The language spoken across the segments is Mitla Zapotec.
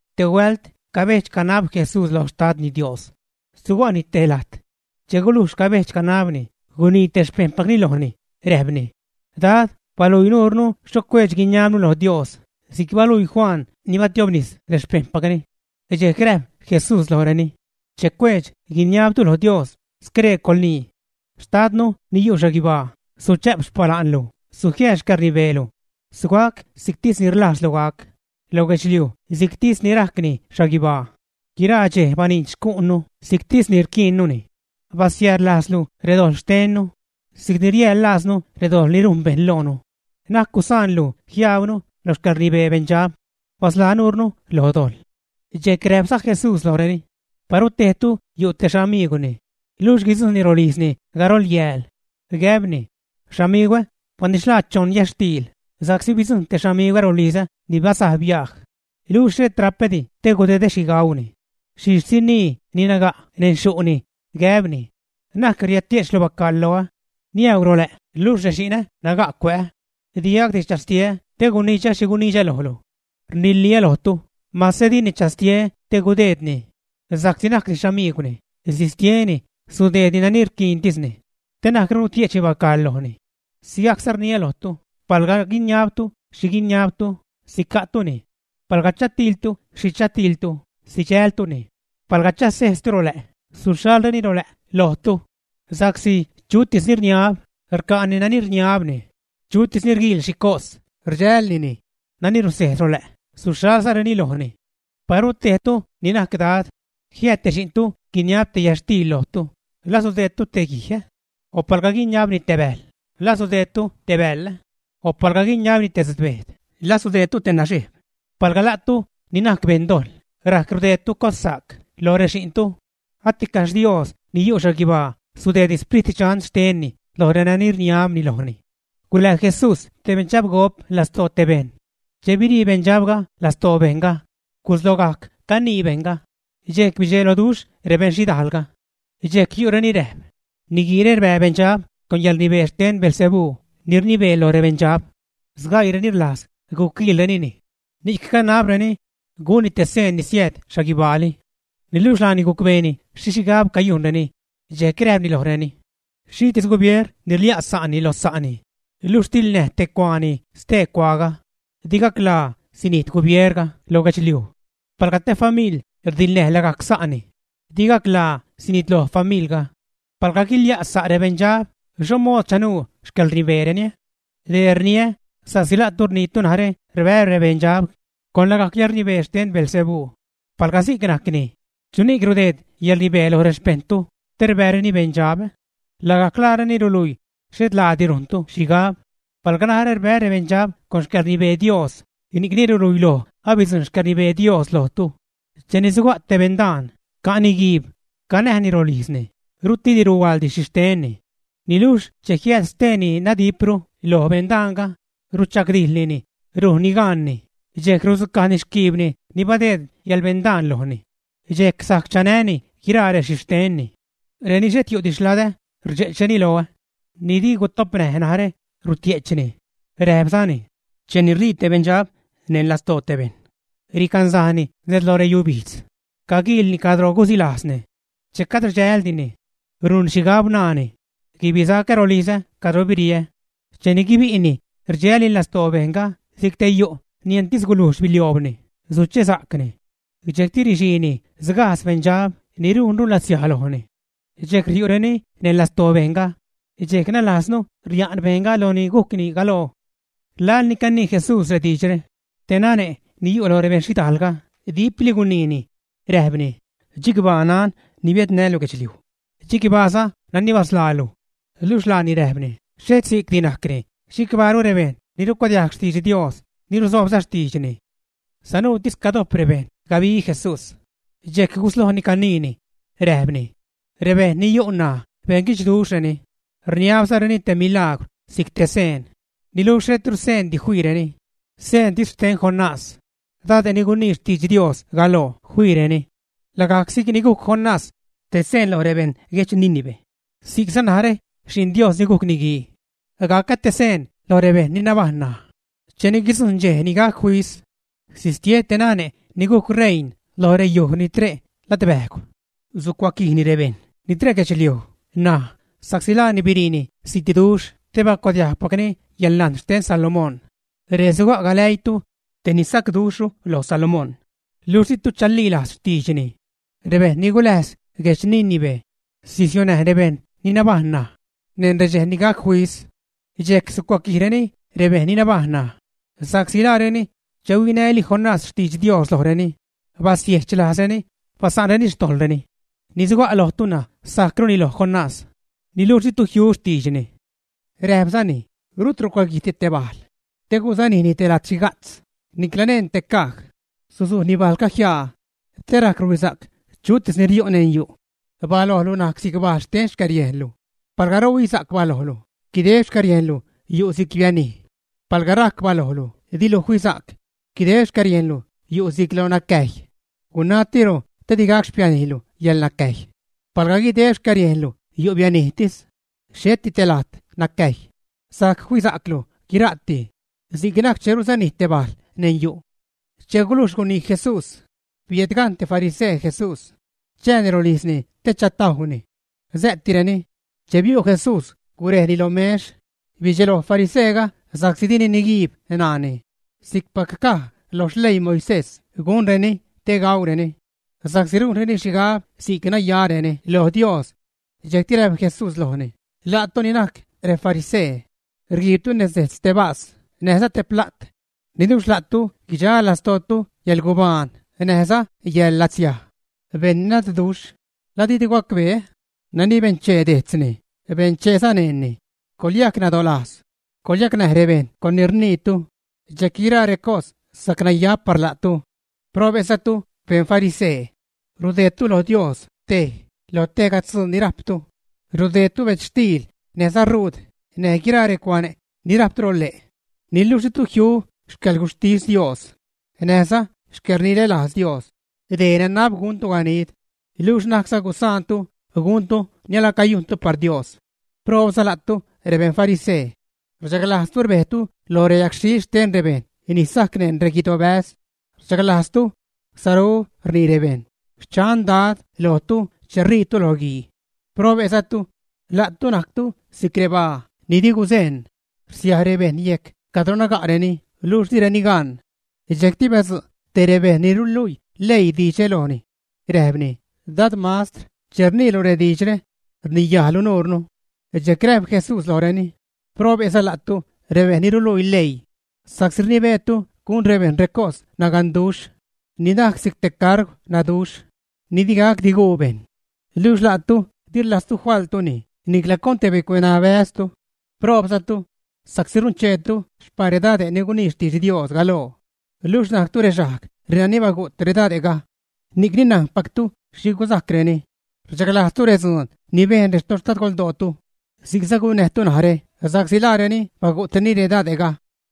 Te huält cabedx-canab Jesús loj Xtadni Dios, suga'ni te lajt. Che gulujx cabedx-canabni, gunii te xpejṉpacni lojni, räjpni: ―Dad, baluii nurnu xho cuedx-guiniabnu lo Dios, si'c baluii Juan ni batiobnis rexpejṉpacni. Dxejc räjp Jesús lojreni: ―Che cuedx-guiniabtu lo Dios, scree coḻnii: Xtadnu ni yu' xhaguibaa, suchä'p xpala'nlu, sujiääd xcäḻrnibeelu. Sugac si'ctisni rlajzlu gac lo guedxliuj si'cpac rajcni xhaguibaa. Guira dxej baniidx xcu'nnu si'ctis ni rquiinnuni. Basiäjḻ lajzlu redojḻ xtennu si'cni riäjḻ lajznu redojḻ ni rujn rebejṉ loonu. Na'c gusaanlu jiajbnu lo xcäḻrnibee beṉdxab. Basḻaa nuurnu lo dojḻ. Dxejc räjpza Jesús lojreni: ―Paru tejtu yu' te xamiigwni, luxh guidzujṉni rolijzni garol yääl, gäbni: “Xamigwä, banidxlaa choṉ yätxtiil, sa'csi bidzujṉ te xamigwä rolizä ni bazaj biaj, luxh xhet ra'pädi te gudedä xhi gauni.” Xhixh sinii ni naga' neṉ xyu'ni, gäbni: “Na'c riädtie'chlu bacaḻ loä. Niäu rolä' luxh rexi'nä naga' cuä'ä, digacdi chästieä te gunidxä xhi gunidxä lojlu.” Rniliä lojtu, mase dini chastie te gudeednini sa'csi najcni xamiigwni, sistieni, sudeedni nani rquiintisni te na'cru gutie'chni bacaḻni. Sigajcza rniä lojtu, palga guiniabtu xhi guiniabtu, sica'tuni. Palga chatiiltu xhi chatiiltu, sidxältuni. Palga chasejztu rolä', suxhalreni rolä' lojtu. Sa'csi chutis ni rniab, rca'ni nani rniabni; chutis ni rguiil xhi cos, rdxälnini; nani rusejz rolä', suxhalzareni lojni. ’Paru tejtu ni najc dad, jiääd te xi'ntu guiniabni te yätxtiil lojtu, ¿la sudeedtu te guij, ä? O palga guiniabni te bäjl, ¿la sudeedtu te bäḻ, ä? O palga guiniabni te tzutbejt, ¿la sudeedtu te naxejb, ä? Palga la'tu, ni najc beṉdojḻ, rajc rudeedtu cossa'c loj rexi'ntu, aticaxh Dios ni yu' xhaguibaa sudeedni Sprit Dxan xtenni loj renani rniabni lojni. Gulää Jesús te beṉdxabgop lastoo te bejṉ. Che birii beṉdxabga lastoo bejṉga, guslogajc canii bejṉga, dxejc bidxeloduxh rebeṉ xhidaalga. Dxejc yu' reni räjp: ―Niguiire rbää rebeṉdxab con yäḻrnibee xten Beelzebú ni rnibee loj rebeṉdxab. Sgaiireni rlajz guquiilrenini, ni'c canabreni gunni te seen ni siääd xhaguibaali. Niluxh laani gucbeeni xhi xhigab cayujnreni dxejc räjpni lojreni: ―Xhitis gubieer ni rlia' sa'ni lo sa'ni, luxh tiḻnäj te cuaani stee cuaaga, di gacḻaa sinijt gubierga lo guedxliuj. Palga te famiḻ rdiḻnäj lagajc sa'ni, di gacḻaa sinitloj famiḻga. Palga guiliä' sa' rebeṉdxab, ¿xho mood chanuu xcäḻrnibeereni? Dee rniä sa'csi la'tu rniitu narä rbää́ rebeṉdxab con lagajc yäḻrnibee xten Beelzebú. Palga si'c najcni, ¿chuni'c rudeed yäḻrnibee loj rexpejṉtu te rbääreni beṉdxab? Lagajc laareni ruluii xhet laadi rujntu xhigab. Palga narä rbää́ rebeṉdxab con xcäḻrnibee Dios, ni'cni ruluiloj abidzujṉ xcäḻrnibee Dios lojtu. ’Cheni suga' te beṉdaan, ca'ni guiib, canäjni rolijzni, rutliidi ruhuaḻdi rexhixtenni. Niluxh che jiääd stee ni nadipru lo beṉdaanga, rudxagdijḻnini, rujnni gaanni, dxejc rudzucajni xquiibni ni badeed yäḻbeṉdaan lojni, dxejc sajc chanäni guiraa rexhixtenni. Reni xhet yu'di xladä, rdxe'chreni loä. Ni di gutopnäj narä, rutie'chni. Räjpzani: ―Cheni rii te beṉdxab neṉ lastoo te bejṉ, ricansajni nez lo reyubijdz, caguiilni cadro gusilajzni. Che cad rdxäldini, rujnni xhigab, naani: “Guibisacä rolizä cadro biriä.” Cheni guibi'ni, rdxälni lastoo bejṉga si'c te yu' ni entis gulujx bilioobni, suchesa'cni. Dxejcti rixiini sgajdz beṉdxab ni rujnru latsiaj lojni. Dxejc riu'reni neṉ lastoo bejṉga, dxejc nalasru ria'n bejṉga loj ni gujcni galoo. Laḻ ni canii Jesús rediidxre, te nane' ni yu' lo rebeṉ xhidaalga dipli guniini, räjpni: ―¡Chicbaa nan ni biädnälu guedxliuj! Chicbaaza nani basḻaa luj. Luxh laani räjpni: ―Xhet si'cdi najcni; chicbaaru rebejṉ ni rucuadiajg xtidx Dios, ni ruzoobza xtiidxni. Sanuutis cadojp rebejṉ gabi Jesús, dxejc guslojni caniini, räjpni: ―Rebejṉ ni yu' ṉaj beṉguidxduxhreni, rniabzareni te milaagwr si'c te seen; niluxh xhetru seendi fiireni, seentis xten Jonás, dade' ni gunii xtidx Dios galoo fiireni. Lagajc si'c ni gujc Jonás te seen loj rebejṉ guedx Nínive, si'cza narä, Xi'n Dios ni gujc Niguii, gacä te seen lo rebejṉ ni nabajṉ ṉaj. Cheni guidzujṉ dxej ni gac fis sistie te nane' ni gujc rein lo reyuj ni tre' ladbäjgw, sucuaquijni rebejṉ ni tre' guedxliuj ṉaj sa'csi laani biriini zitduxh te bacuadiajgpacni yäḻnajn xten Salomón. Ree suga' galäiitu tej ni sacduxhru lo Salomón, luxh ditu chalilajz xtiidxni. Rebejṉ ni guläjz guedx Nínive sisiunäj rebejṉ ni nabajṉ ṉaj neṉ redxej ni gac fis. Dxejc sucuaquijreni rebejṉ ni nabajṉ ṉaj sa'csi laareni, che huinäli Jonás xtidx Dios lojreni, basiechlajzreni, basa'nreni xtojḻreni. Ni suga' lojtu ṉaj sajcruni lo Jonás, niluxh ditu jiu xtiidxni. Räjpzani: ―Rut rucuaguijdi te bajl, te gusujnini te lat xhiga'tz, niclaza neṉ te caj. Susujni bajlga jiaa te rajc ruhuisa'c chutis ni riu' neṉ yu'. Balojlu najc si'c bajl xten xcäriejnlu. Palga ruhuisa'c balojlu, guideb xcäriejnlu yu' si'c bianij. Palga rajc balojlu dilu fisa'c, guideb xcäriejnlu yu' si'c lo nacäjy. Gunatiro te di gac xpianijlu yäḻnacäjy. Palga guideb xcäriejnlu yu' bianijtis, xheti te lajt nacäjy, sajc fisa'clu guira'ti, si'c najc che rusanij te bajl neṉ yu'. Che gulujx gunii Jesús, biädgajṉ te farisee Jesús chääni rolijzni te chatajwni. Sä'tireni. Che biu' Jesús, gurejni lo mex. Bidxeloj fariseega sa'csi dini niguiib ṉaani si'cpac caj lo xleii Moisés gunreni te gaureni, sa'csi rujnreni xhigab si'c racnayareni lo Dios. Dxejcti räjp Jesús lojni: ―La'tu ni najc refarisee, rguiibtu nez dejtz te bas näjza te pla't, niluxh la'tu guidxa lastootu yäḻgubaan näjza yäḻlatsiaj. ¡Beṉ nadduxh! ¿La ditu gacbee? Nani benchee dejtzni, bencheeza neṉni. Coḻyajc nadolajz, coḻyacnäj rebejṉ con ni rniitu, dxejc guiraa recos sajc naya par la'tu. ’¡Probe'zatu, beṉ farisee! Rudeedtu lo Dios tej lo tejga tzuu ni rajptu: rudeedtu bedzxtiil näjza ruud, näj guiraa recuane' ni rajptu lo le', niluxh ditu jiu xcäḻguxhtis Dios näjza xcäḻrinälajz Dios. Dee nanab guntu ganid, luxh na'cza gusaantu guntu ni alacayujntu par Dios. ’¡Proobza la'tu rebeṉ farisee! Rchaglajztu rbejtu lo reyagxhil xten rebejṉ ni sajc neṉ reguidobäz; rchaglajztu saru rnii rebejṉ “xchan Dad” lojtu che rijtu lo guii. ’¡Probe'zatu! La'tu najctu si'c rebaa ni di guzeṉ, rsiaj rebejṉ yejc cadro naga'reni luxh direni gan. Dxejcti badzu' tej rebejṉ ni ruluii leii diidxre lojni, räjpni: ―Dad mastr, che rniilu rediidxre, rniyajlu nuurnu. Dxejc räjp Jesús lojreni: ―¡Probe'za la'tu rebejṉ ni ruluii leii! Sa'csi rnibeetu gun rebejṉ recos naganduxh ni najc si'c te cargw naduxh ni di gacdi guu bejṉ. Luxh la'tu di rlajztu faḻtuni nicla con te bicueṉabäztu. ’¡Proobzatu! Sa'csi runcheetu xpaa redade' ni gunii xtidx Dios galoo, luxh najctu rexajg renani bagu't redade'ga. Ni'cni najnpactu xhi gusajcreni, rchaglajzzatu redzuun ni bejn retoxtadgoldootu; si'cza gunnäjtu narä sa'csi laareni bagu'treni redade'ga,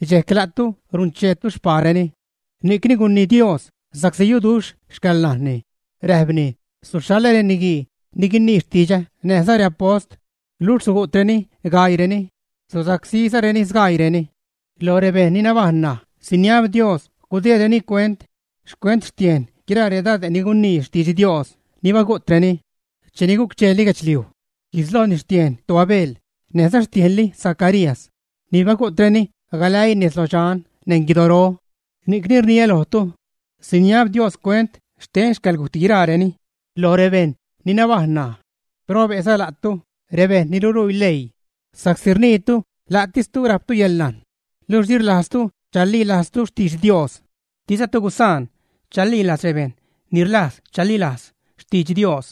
dxejc la'tu runcheetu xpaareni. ’Ni'cni gunii Dios, sa'csi yuduxh xcäḻnajnni, räjpni: “Suxhaḻä reniguii ni guinii xtidxä näjza reapost, luxh sugu'treni gaiireni, susacsízareni sgaiireni.” Loj rebejṉ ni nabajṉ ṉaj siniab Dios gudeedreni cuent xcuent xtiejn guiraa redade' ni gunii xtidx Dios ni bagu'treni cheni guc-cheeli guedxliuj. Guislojni xtiejn toAbel, näjza xtiejnli Zacarías ni bagu'treni galäii nez lodxan neṉ guidoro. Ni'cni rniä lojtu, siniab Dios cuent xten xcäḻgujt guiraareni loj rebejṉ ni nabajṉ ṉaj. ’¡Probe'za la'tu, rebejṉ ni ruluii leii! Sa'csi rniitu la'tistu rajptu yäḻnajn, luxh di rlajztu chalilajztu xtidx Dios, dizatu gusaan chalilajz rebejṉ ni rlajz chalilajz xtidx Dios.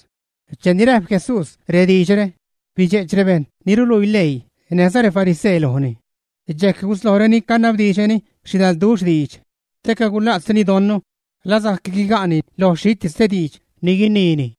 Cheni räjp Jesús rediidxre, bidxe'ch rebejṉ ni ruluii leii näjza refarisee lojni. Dxejc guslojreni canabdiidxreni xhidalduxh diidx, te cagula'tzreni don la sajc guiga'ni lo xhitis te diidx ni guiniini.